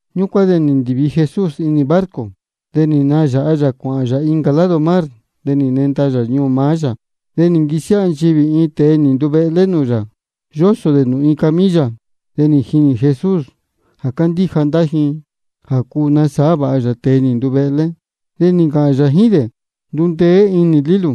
Ñúcuán de nī ndīvi Jesús inī barco. De nī nayāha yā cuāhān yā incā lado mar, de nī nenda yā ñuū maá yā. De nī nquisiáha nchivī iin tēe nī nduvehlé nūū yā, yósō dē nūū iin camilla. De nī jinī Jesús jā cándíja ndá ji jā cuu nasāhá vāha yā tēe nī nduvehlé. De nī ncāhān yā jíín dē: Ndundeé inī nū lílū,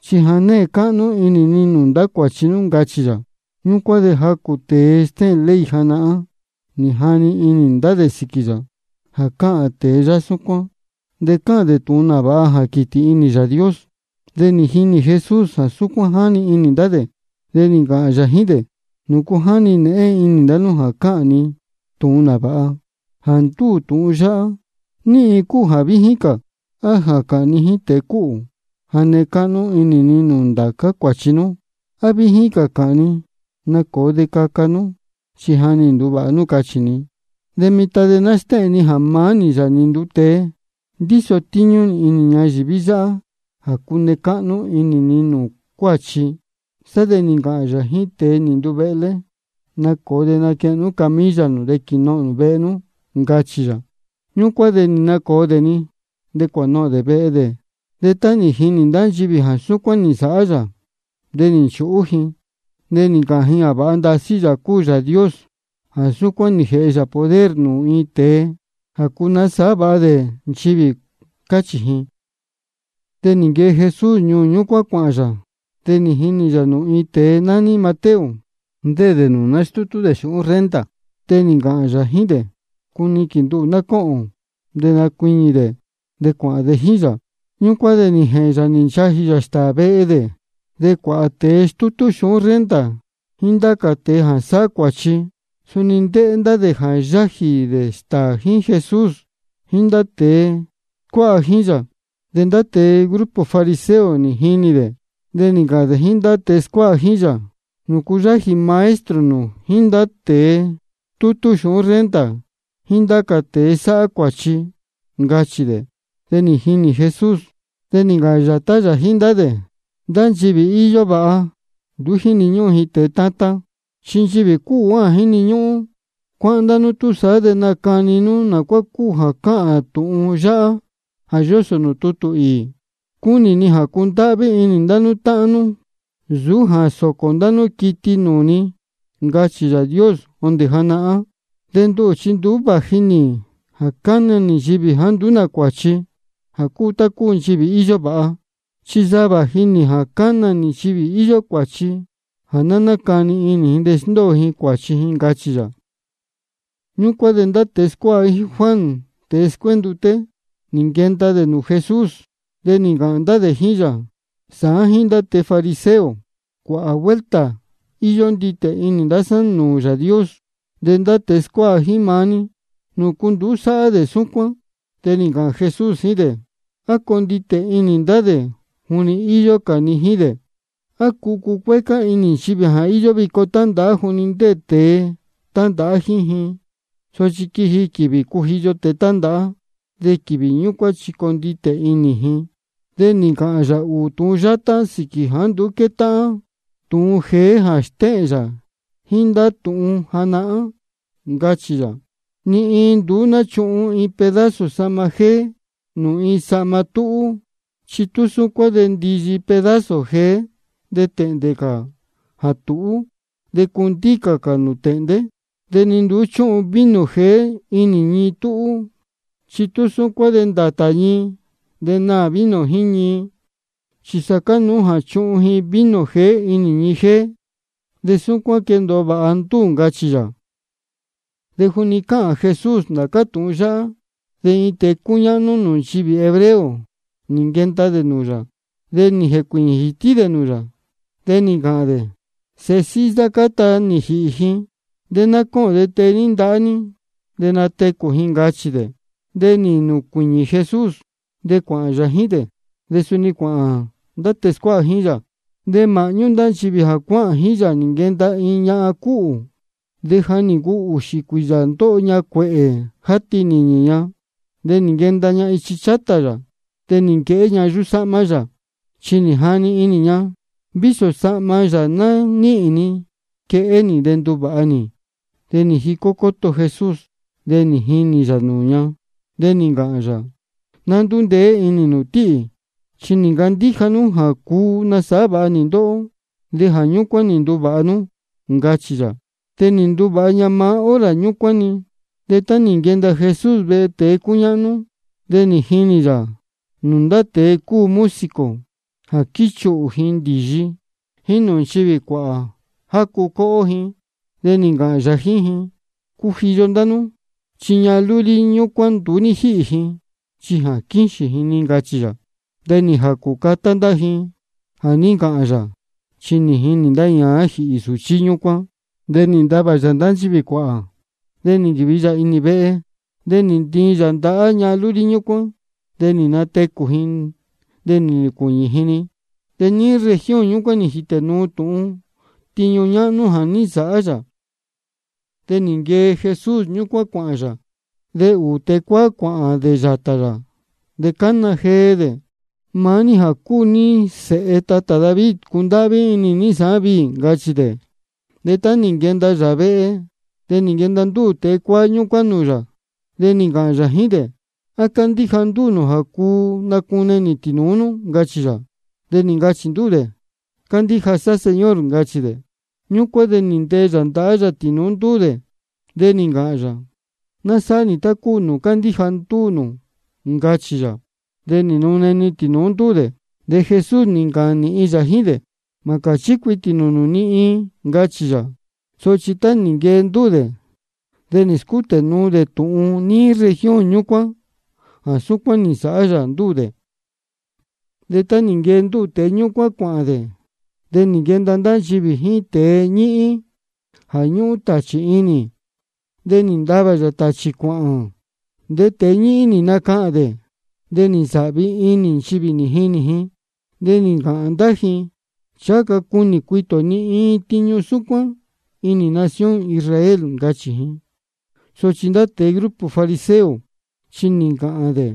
chi ja née cáhnú inī ni nūū ndá cuāchi nú, ncachī yā. Ñúcuán de jacū tēe stéhēn ley janahán, nī jani inī ndá dē sīquī yā: Jā cáhān tēe yáhá súcuán, de cáhān dē tūhun nāvāha jā quītī inī Yāā Dios. De nī jinī Jesús jā súcuán jáni inī ndá dē, de nī ncāhān yā jíín dē: ¿Nūcu jáni nēhén inī ndá nú jā cáhān ni tūhun nāvāha? Jā ndúū tūhun yáhá, ¿ní iin cúu jā víjín cā? ¿A jā cāhān ni jíín tēe cúhū: Ja née cáhnú inī ni nūū ndācá cuāchi nú? ¿A víjín cā jā cāhān ni: Nacōo de caca nú, chi ja nī nduvāha nú, cachī ni? De mitan de ná stéhēn ni jā maá nī, Yāā nī nduu tēe, ndíso tíñú nī inī ñayīví yáhá jā cune cáhnú inī ni nūū cuáchi. Sá de nī ncāhān yā jíín tēe nī nduvehlé: Nacōo de naquehen nú camilla nū de quīnohōn nū vehe nú, ncachī yā. Ñúcuán de nī nacōo dē-ni, de cuānohōn dē vehe dē. De tá nī jinī ndá nchivī jā súcuán nī nsāhá yā, de nī nchūhú ji. De nī ncāhān ji jā vāha ndasí Yāā cúu Yāā Dios jā súcuán nī jēhe yā poder nūū iin tēe jā cuu nasāhá vāha dē nchivī, cáchī ji. De nī nquee Jesús ñúcuán cuāhān yā. De nī jinī yā nūū iin tēe nání Mateo, ndéē dē nūū nástútú dē xūhún renta. De nī ncāhān yā jíín dē: Cuniquīn nduhū ná cóhōn. De nī nacuiñī dē, de cuāhān dē jíín yā. Ñúcuán de nī jēhēn yā nī nchajī yā stāā vehe dē. De cuāhā tēe stútú xūhún renta jíín ndá cā tēe jā sáhá cuāchi, suni ndéē ndá dē yájī dē stāā jíín Jesús jíín ndá tēe scuáha jíín yā. De ndá tēe grupo fariseo nī jinī dē, de nī ncāhān dē jíín ndá tēe scuáha jíín yā: ¿Nūcu yájī maestro nū jíín ndá tēe stútú xūhún renta jíín ndá cā tēe sáhá cuāchi? ncachī dē. De nī jini Jesús, de nī ncāhān yātá yā jíín ndá dē: Ndá nchivī íyó vāha, nduú jíni ñúhún ji tēe tátán, chi nchivī cúhū cúu jā jíni ñúhún. Cuáhán ndá nú túsaá, de nacani inī nū nā cuá cúu jā cáhān tūhun yáhá jā yósō nūū tutū īī: Cúnī ni jā cundáhví inī ndá nú táhán nú, nsūú jā sōcō nū ndá quiti nūū ni, ncachī Yāā Dios jondē janahán. De nduhū chi nduú vāji nī jā cana nī nchivī jāá nduú cuāchi, jā cúu tá cúu nchivī íyó vāha, chi sa vāji nī jā cána nī nchivī íyó cuāchi, jā ná nácani inī ji de sndóo ji cuāchi ji, ncachī yā. Ñúcuán de ndá tēe scuáha jíín Juan tēe scuénduté, nī nquenda dē nūū Jesús. De nī ncāhān ndá dē jíín yā: Sāán jíín ndá tēe fariseo, cuāhā vuelta íyó nditē inī ndá sá nūū Yāā Dios. De ndá tēe scuáha jíín maá ní, ¿nūcu nduú sáhá dē súcuán? De nī ncāhān Jesús jíín dē: ¿A cuu conditē inī ndá dē juni íyó cā ni jíín dē? ¿A cuu cucuécá inī nchivī jā íyó vico tándāhá juni ndéē tēe tándāhá jíín ji? Sochi quiji quīvī jā cujiyo tēe tándāhá, de quīvī ñúcuán chi conditē inī ji. De nī ncāhān yā ūū tūhun yátá sīquī jāá nduú quétáhán tūhun jeé jā stéhēn yā jíín ndá tūhun janahán. Ncachī yā: Ni iin nduú náchuhun iin pedazo sahma jéé nūū iin sahma túhú. Chi tú súcuán de ndiyi pedazo jeé de tēhndē cā jā tūhú, de cundícā cā nūū tēhndé. De ni nduú chúhun vino jeé inī ñii túhú. Chi tú súcuán de ndātā ñii, de naā vino jíín ñii. Chi sa cánuú jā chuhun ji vino jeé inī ñii jéé, de súcuán de quendōo vāha ndúū, ncachī yā. De juni cáhān Jesús ndācá tūhun yáhá, de iin tēe cúñáhnú nūū nchivī hebreo nī nquenda dē nūū yā. De nī jēcuīñī jītí dē nūū yā, de nī ncāhān dē: Sēhe síhí sá, cáta nī jīhī ji. De á mā cóhōn de tee ní ndahá ní ji, de natecū ji, ncachī dē. De nī nacuiñī Jesús, de cuāhān yā jíín dē, de suni cuāhān ndá tēe scuáha jíín yā. De māhñú ndá nchivī jā cuáhān jíín yā nī nquenda iin ñahan cúhū, de ja nī ncuu ūxī ūū cuīyā ndóho ña cuēhē játi nīñī ña. De nī nquenda ña ichi chátā yā, de nī nquehé ña yuhú sáhmá yā. Chi nī jani inī ña: Vísō sahma yā ná níhīn ni quehé nī, de nduvāha nī. De nī jicó cóto Jesús, de nī jinī yā nūū ña, de nī ncāhān yā: Ná ndúndeé inī nū tíhī. Chi nī ncandíja nú jā cuu nasāhá vāha nī ndóhó, de jā ñúcuán nī nduvāha nú, ncachī yā. De nī nduvāha ña maá hora ñúcuán-ni. De tá nī nquenda Jesús vehe tēe cúñáhnú, de nī jinī yā nūū ndá tēe cúu músico jā quíchuhū dē ndīyi, jíín nūū nchivī cuāhā, jácu cóhó ji. De nī ncāhān yā jíín ji: Cujiyo ndá nú, chi ñahan lúlí ñúcuán nduú ní jíhī ji, chi quíxīn ji-ni, ncachī yā. De nī jācū catá ndá ji jā ní ncāhān yā, chi jínī ji jā ní jīhī sūchí ñúcuán. De nī ntavā yā ndá nchivī cuāhā, de nī nquīvi yā inī vehe. De nī ntiin yā ndahá ñahan lúlí ñúcuán, de nī natecū ji, de nī nacuiñī ji-ni. De níí región ñúcuán nī jītē nuu tūhun tiñu ñáhnú jā ní nsāhá yā. De nī nquee Jesús ñúcuán cuāhān yā. De ūū tēe cuáá cuāhān dē yātā yā, de cána jee dē: Maá ní jā cúu ní Sēhe tatā David, cundáhví inī ní sāán viī, ncachī dē. De tá nī nquenda yā vehe, de nī nquenda ndúū tēe cuáá ñúcuán nūū yā. De nī ncāhān yā jíín dē: ¿A cándíja ndúū nū jā cuu nacune nī tīnūú nú? ncachī yā. De nī ncachī ndúū dē: Cándíja sá Señor, ncachī dē. Ñúcuán de nī ntee yā ndahá yā tīnūú ndúū dē, de nī ncāhān yā: Ná sáhá nī tá cúu nūū cándíja ndúū nū, ncachī yā. De nī nune-ni tīnūú ndúū dē. De Jesús nī ncāhān nīhin yā jíín dē: Mā cāchí cuitī nū nūū ni iin, ncachī yā. Sochi tá nī nquee ndúū dē, de nī scútē nuu dē tūhun níí región ñúcuán jā súcuán nī nsāhá yā ndúū dē. De tá nī nquee ndúū tēe ñúcuán cuāhān dē, de nī nquenda ndá nchivī jíín iin tēe ñíhín jā ñúhún tāchī inī dē. De nī ntavā yā tāchī cuāhān. De tēe ñíhín nī nacahān dē. De nī nsāhvi inī nchivī nī jinī ji, de nī ncāhān ndá ji: Ncháha ca cunī cuitī ō ni iin tiñu súcuán inī nación Israel, ncachī ji. Sochi ndá tēe grupo fariseo chi nī ncāhān dē: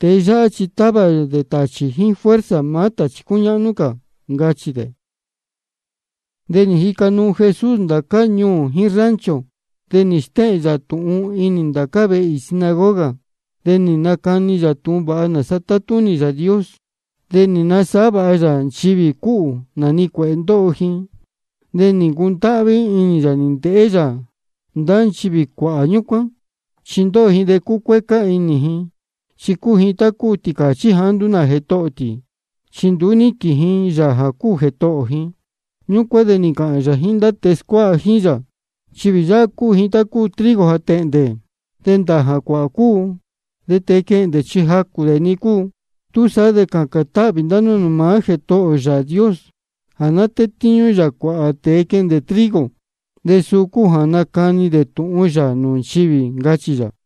Tēe yáhá chi távā dē tāchī jíín fuerza maá tāchī cúñáhnú cā, ncachī dē. De nī jica nuu Jesús ndācá ñuū jíín rancho, de nī stéhēn yā tūhun inī ndācá vehe īī sinagoga. De nī nacani yā tūhun vāha nāsa tátúnī Yāā Dios. De nī nasāhá vāha yā nchivī cúhū nā-ni cuēhē ndóho ji. De nī ncundáhví inī yā nī ndēhé yā ndá nchivī cuāhā ñúcuán. Chi ndóho ndá ji de cúcuécá inī ji, chi cúu ji tá cúu tīcāchí jāá nduú jētohō tī, chi nduú níquīn ji Yāā jā cúu Jētohō ji. Ñúcuán de nī ncāhān yā jíín ndá tēe scuáha jíín yā: Nchivī yáhá cúu ji tá cúu trigo jā tēhndē, de ndāā jā cuāhā cúu, de tēe quehndē chi jacū dē-ni cúu. Túsaá de cācān táhvī ndá nú nūū maá Jētohō nū Yāā Dios jā ná tétíñú yā cuāhā tēe quehndē dē trigo, de suu cúu jā nacani dē tūhun yā nūū nchivī, ncachī yā.